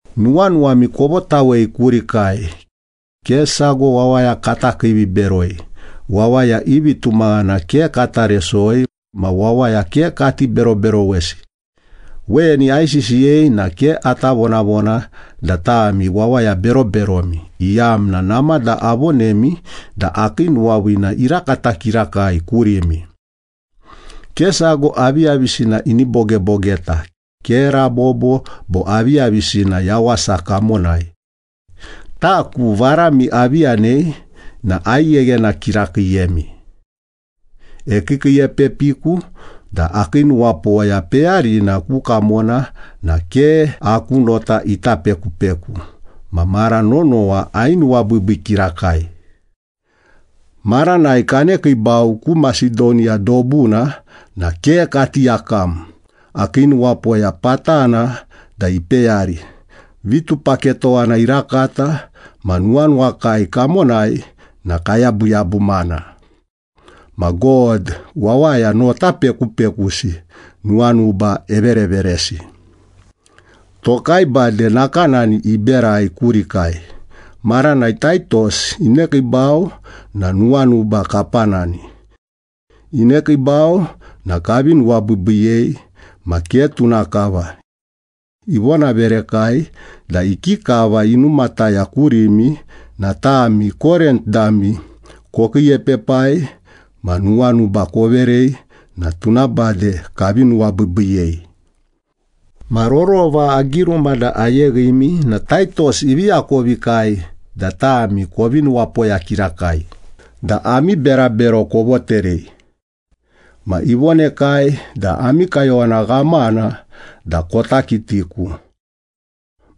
Nuwanuwami kovotawei kurikai. Ke sago wawaya kata kiiviberoi, wawaya i vitumaghana ke kata resoi, ma wawaya ke kati beroberowesi. Weni aisisiyei na ke ata vonavona da tami wawaya beroberomi, iyamna namada avonemi da akii nuwaviina irakata kirakai kurimi. Ke sago aviyavisina ini bogebogeta, ke rabobo bo aviyavisina yawasa kamonai. Taku varami avi yanei na aigheghena kirakiiyemi. Ekiikiiepepiku da akii nuwapoya peyarina ku kamona na ke aku nota ita pekupeku, ma mara nonowa ainuwabiibii kirakai. Maranai kanekiibau ku Masedoniya dobuna na ke kati yakam, akii nuwapoya patana da ipeyari, vitupaketowana irakata ma nuwanuwakai kamonai na kayabuyabumana. Ma God wawaya nota pekupekusi nuwanuba evereveresi. Tokai bade nakanani iberai kurikai, maranai Taitos inekiibau na nuwanuba kapanani. Inekiibau na kavi nuwabiibiiyei, ma ke tuna kava. Ivonaverekai da ikikava inumataya kurimi na tami Korint dami kokiiepepai ma nuwanuba koverei na tuna bade kavi nuwabiibiiyei. Ma rorova agiruma da ayeghimi na Taitos ivi akovikai da tami kovi nuwapoya kirakai da ami berabero kovoterei. Ma ivonekai da ami kayowana ghamana da kota kitiku.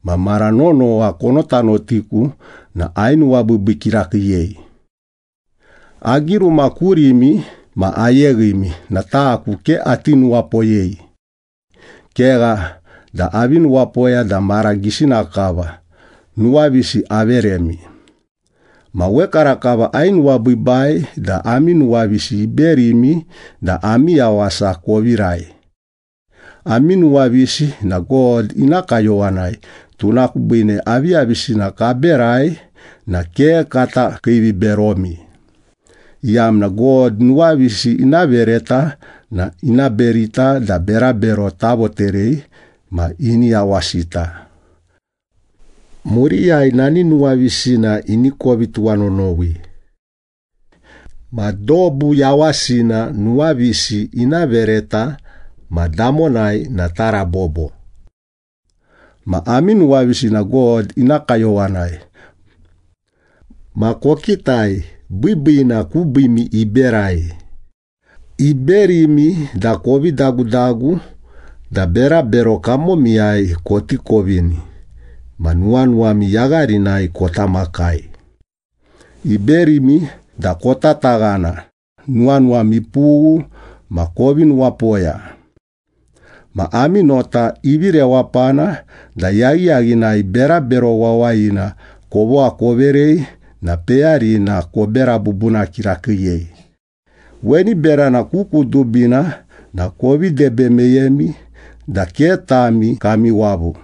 Ma mara nonowa konotanotiku na ainuwabiibii kirakiiyei. Agiruma kurimi ma ayeghimi na taku ke ati nuwapoyei. Kegha da avi nuwapoya da mara gisina kava nuwavisi averemi, ma wekarakava ainuwabiibai da ami nuwavisi iberimi da ami yawasa kovirai. Ami nuwavisi na God ina kayowanai, tuna kubiine aviyavisina kaberai na ke kata kiiviberomi, iyamna God nuwavisi ina vereta na ina berita da berabero tavoterei ma ini yawasita. Muriyai nani nuwavisina ini kovi tuwanonowi. Ma dobu yawasina nuwavisi ina vereta ma damonai na tarabobo. Ma ami nuwavisi na God ina kayowanai. Ma kokitai, biibiina kubiimi iberai. Iberimi da kovi dagudagu da berabero kamomiyai koti kovini ma nuwanuwami yagharinai kota makai. Iberimi da kotataghana, nuwanuwam ipughu, ma kovi nuwapoya. Ma ami nota ivi rewapana da yaghiyaghinai berabero wawayina kovogha koverei na peyarina kobera bubuna kirakiiyei. Weni berana ku kudubina na kovi debe meyemi da ke tami kami wavu.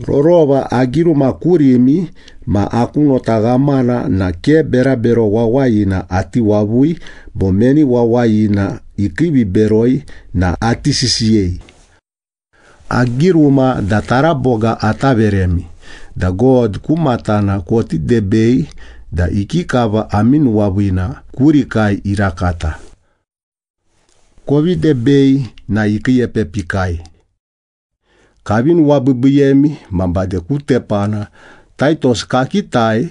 Rorova agiruma kurimi ma aku nota ghamana na ke berabero wawayina ati wavui bo meni wawayina ikiiviberoi na ati sisiyei. Agiruma da taraboga ata veremi da God ku matana koti debei da ikikava ami nuwaviina kurikai irakata. Kovi debei na ikiiepepikai. Kavi nuwabiibiiyemi ma bade ku tepana Taitos kakitai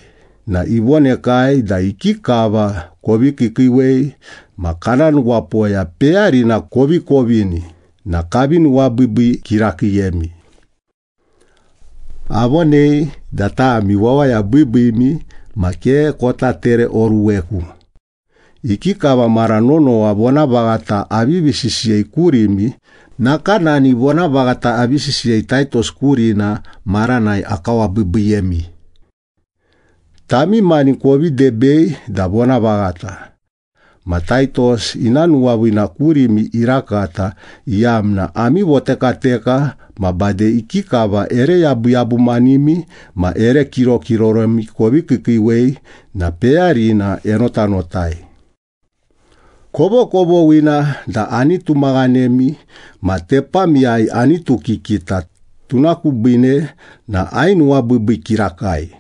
na ivonekai da ikikava kovi kiikiiwei ma kana nuwapoya peyarina kovi kovini na kavi nuwabiibii kirakiiyemi. Avonei da tami wawaya biibiimi ma ke kota tereoruweku. Ikikava mara nonowa vonavaghata avivi sisiyei kurimi, nakanani vonavaghata avi sisiyei Taitos kurina maranai akawabiibiiyemi. Tami mani kovi debei da vonavaghata. Ma Taitos ina nuwaviina kurimi irakata, iyamna ami votekateka ma bade ikikava ere yabuyabumanimi ma ere kirokiroromi kovi kiikiiwei na peyarina enotanotai. Kovokovoghina da ani tumaghanemi ma tepamiyai anitukikita, tuna kubiine na ainuwabiibii kirakai.